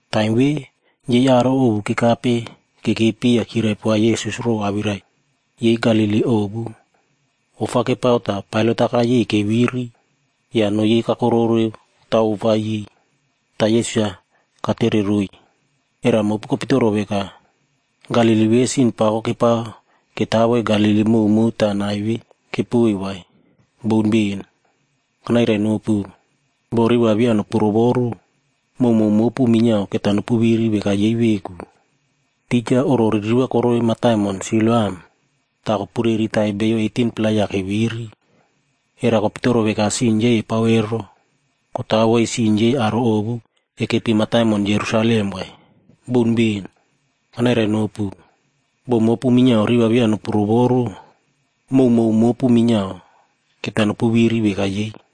Taim ve, yei aro ovu kekape kekepi ya kyirai poa Yesus row awirai yei Galili ovu. Ofa kepao ta Pailat-a kayei keviri ya noꞌo yei kakororeu taw ofa yei. Ta Yesus-a katereroiy, “Era mopu kopitoro veka, Galili ve sin pako kepao ketawoi Galili mowmow ta nai ve kepoiy vai? Boun ben! Kanairainopu, bo riꞌi va via nopu rovoru, mowmow mopu minyiao keta nopu viri veka yei veku. Tija oꞌro ririva koroi mataimon Siloam ta kopureritai beiyo 18-pla ya keviri. Era kopitoro veka sin yei epao ero kotawoi sin yei aro ovu ekepi mataimon Jerusalem vai? Boun ben! Kanairainopu, bo mopu minyiao riꞌi va via nopu rovoru, mowmow mopu minyiao keta nopu viri veka yei.”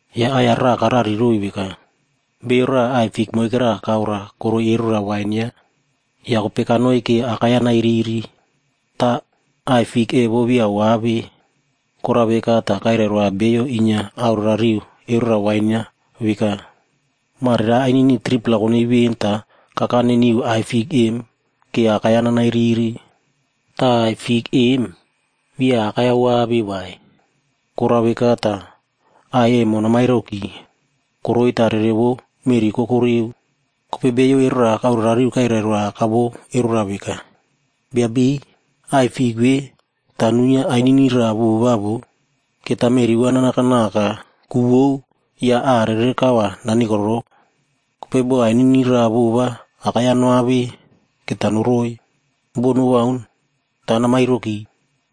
Ya aꞌai-ya raꞌa karariroiy veka, “Beiyo raꞌa aꞌai fik moikera kaora koroi erora wain yaꞌa. Ya kopei kanoi ke akai-ya nairiri, ta aꞌai fik evo via oave. Korao veka ta kairai roa bio inyia aorerariu erora wain-a veka, ‘Mare ainini 3-pla konoi ven ta kakane niu aꞌai fik em ke akai-ya nanairiri. Ta aꞌai fik em, via akai-ya oave vai. Korao veka ta aꞌai emo namairoki. Koroi ta rere vou meꞌri koko reu.’ “Kopei bio erora kaorerariu kairai roa aka vou erora veka, ‘Bia beiy, aꞌai fik ve ta nuinyia ainini raꞌa vova vo. Keta meꞌri va nanakanaka ku vou ya aꞌa rere kau va nanikorou. Kopei bo ainini raꞌa vova akai-ya noave, keta noroi, bo nowaun ta namairoki.’”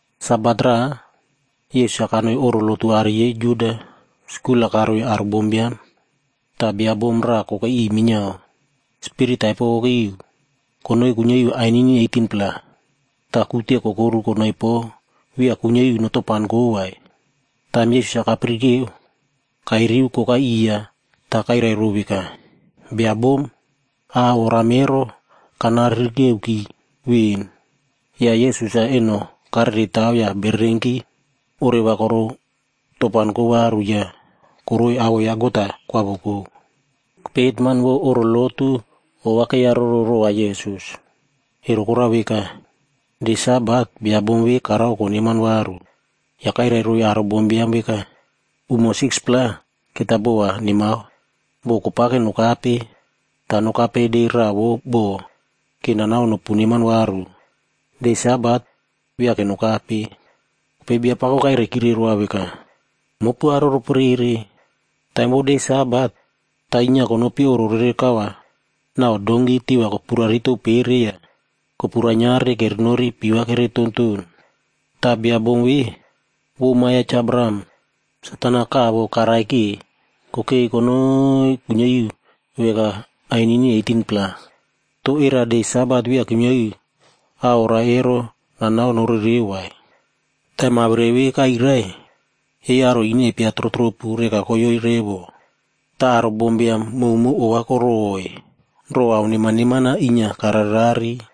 Sabat raꞌa, Yesus-a kanoi oꞌro lotu aꞌari yei Juda skul-a karoiy aro bombiam. Ta bia bom raꞌa kokei iꞌiy minyiao, spirit taipo kokei iu konoi kuinyia iu ainini 18-pla. Ta kute kokoru konoi po via kuinyia iu notopanko vai. Taim Yesus-a kapirikeo, kairiu kokai iya ta kairai row veka, “Bia bom, a oram ero kana ririkeuki ven.” Ya Yesus-a eno karere taw ya bererenki oreva korou topanko varu ya koroi awoꞌo ya God-a kwavoko. Kopei hetman vou oꞌro lotu ova keiyaroro rova Yesus. Ero korao veka, de Sabat bia bom ve karao koneman varu. Ya kairai roiy aro bombiam veka, “Umo 6-pla keta bo va nemao. Bo kopake nokape, ta nokape de raꞌa vou bo ke nanao nopu neman varu. De Sabat via ke nokape.” Kopei Biapako kairaikire roa veka, “Mopu aro roporere! Taim vou de Sabat, ta inyia konopi oꞌro rere kau va nau donki tiꞌi va kopuraritou pere ya kopu rainyiare kerenori pii va kere tonton. Ta bia bom ve, vou ma ya Cha Abraham. Satan-a kavo karaike kokei konoi kuinyia iu veka ainini 18-pla. To era de Sabat via kuinyia iu a orao ero nanao norereu vai?” Taim awirai ve kairai, yei aro ine epia trotropu reka koyoe revo. Ta aro bombiam mowmow ova koroꞌoi row ao neman neman-a inyia kararerare.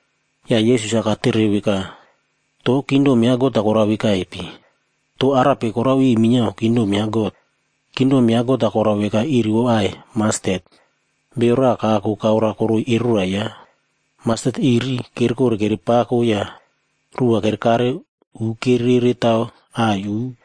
Ya Yesus-a katere veka, “To Kingdom ya God-a korao vekaipe? To arape korao iu minyiao Kingdom ya God? Kingdom ya God-a korao veka iri vou aꞌai mastet,a bio raꞌa kako kaora koroi erora yaꞌa. Mastet iri kerekore kerepako ya ruꞌu va kerekare u kererere taw aꞌai uꞌ.”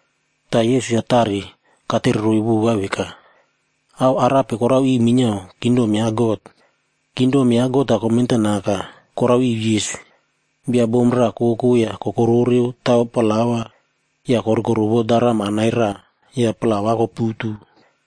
Ta Yesus-a tare katereroiy vova veka, “Ao arape korao iu minyiao kingdom ya God? Kingdom ya God-a komentanaka korao iu yis, bia bom raꞌa koko ya kokororeu taw plaua ya korikorovo daram anai raꞌa ya plauab koputu.”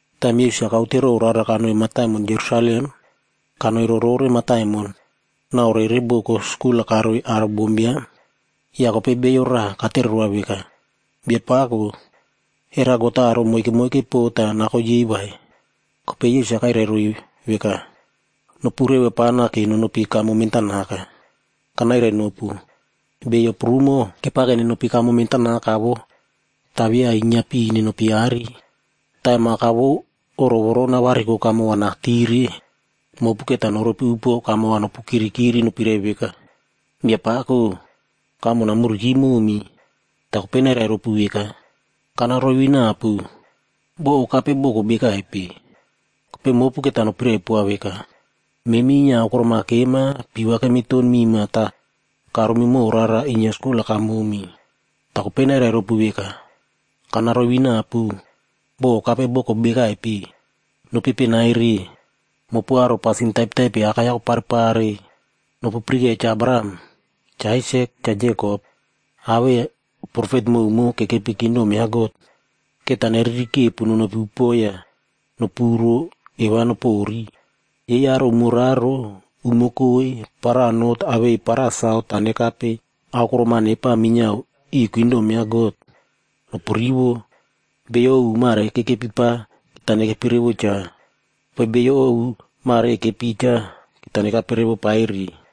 Taim Yesus-a kaute row rara kanoi mataimon Jerusalem, kanoi rorore mataimon nau rere boko skul-a karoiy aro bombiam. Ya kopei bio raꞌa katere roa veka, “Biapako, era God-a aro moike moike po ta nako yei vai?” Kopei Yesus-a kairai roiy veka, “Nopu reva pana ke nonopi kamo mentanaka. Kanairainopu, beiyo prumo kepake nenopi kamo mentanaka vo, ta via inyiapi nenopi aꞌari. Taim aka vou oꞌro voro navariko kamo va natire, mopu keta noropi upuo kamo va nopukirikiri nopirai veka, ‘Biapako, kamo namuriki momi.’ Ta kopei nairai ropu veka, ‘Kana roivinapu, bo okape boko bekaipe.’ “Kopei mopu keta nopirai poa veka, ‘Memi inyia aokorom-a kema pii va kemiton mima ta karomi mow rara inyia skul-a kamomi.’ “Ta kopei nairai ropu veka, ‘Kana roivinapu, bo okape boko bekaipe. Nopepenaire, mopu aro pasin taipetaipe akai-ya koparepare.’ “Nopu pirikeiya Cha Abraham, Cha Aisak, Cha Jekopc awei profet mowmow kekepi kingdom ya God. Keta neririkepu nonopi upuo ya nopuro eu va nopori. Yei aro umo raro, umo koi, para not awei para saut ta nekape aokorom-a nepa minyiao iu kingdom ya God. Nopurivo, beiyo ovu mare kekepi pa keta nekepi revo cha. Kopei beiyo ovu mare ekepi cha, keta nekape revo paire.”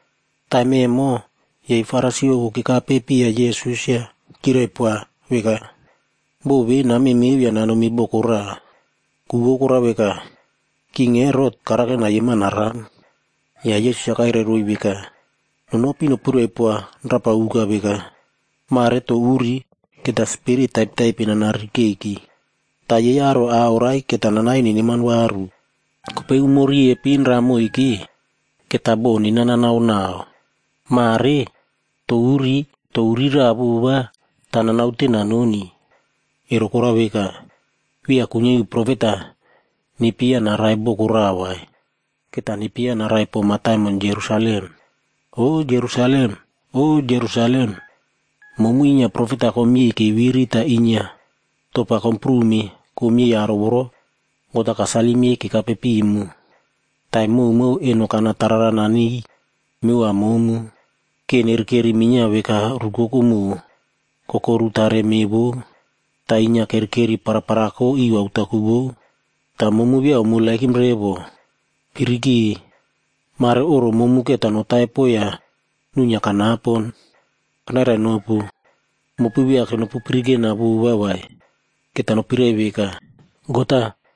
Taim emo, yei Farisi ovu kekapepiya Yesus ya kyirai poa veka, “Bo ve namemeo ya nanomi boko raꞌa, ku vou korao veka, King Herot karake nayema naram.” Ya Yesus-a kairai roiy veka, “Nonopi nopirai poa rapa uka veka, ‘Mare to uri keta spirit taipetaipe nana ririkeiki. Ta yei aro a oraie keta nanaie neneman varu. Kopei umo riepin raꞌa moike, keta bo nena nanao nau.’ Mare to uri to uri raꞌa vova, ta nanaute nanoni. Ero korao veka, via kuinyia iu profet-a nepyeiya narai boko raꞌa vai. Keta nepyeiya narai po mataimon Jerusalem. “O Jerusalem! O Jerusalem! Momu inyia profet-a komyei keviri ta inyia topa komprume komyei aro voro God-a kasalim yei kekape pimu. Taim mowmow eno kana tarara naniy mevova momu, ke nerekeri minyiao veka rukoko moꞌo, kokoru tare meꞌe vou. Ta inyia kerekeri paraparako iu aotaku vou. Ta momu via omeremow revo! Pirike! Mare oꞌro momu keta notaipo ya nuinyia kanapon. Kanairainopu, mopu via ke nopupirikena vova vai, keta nopirai veka, ‘God-a,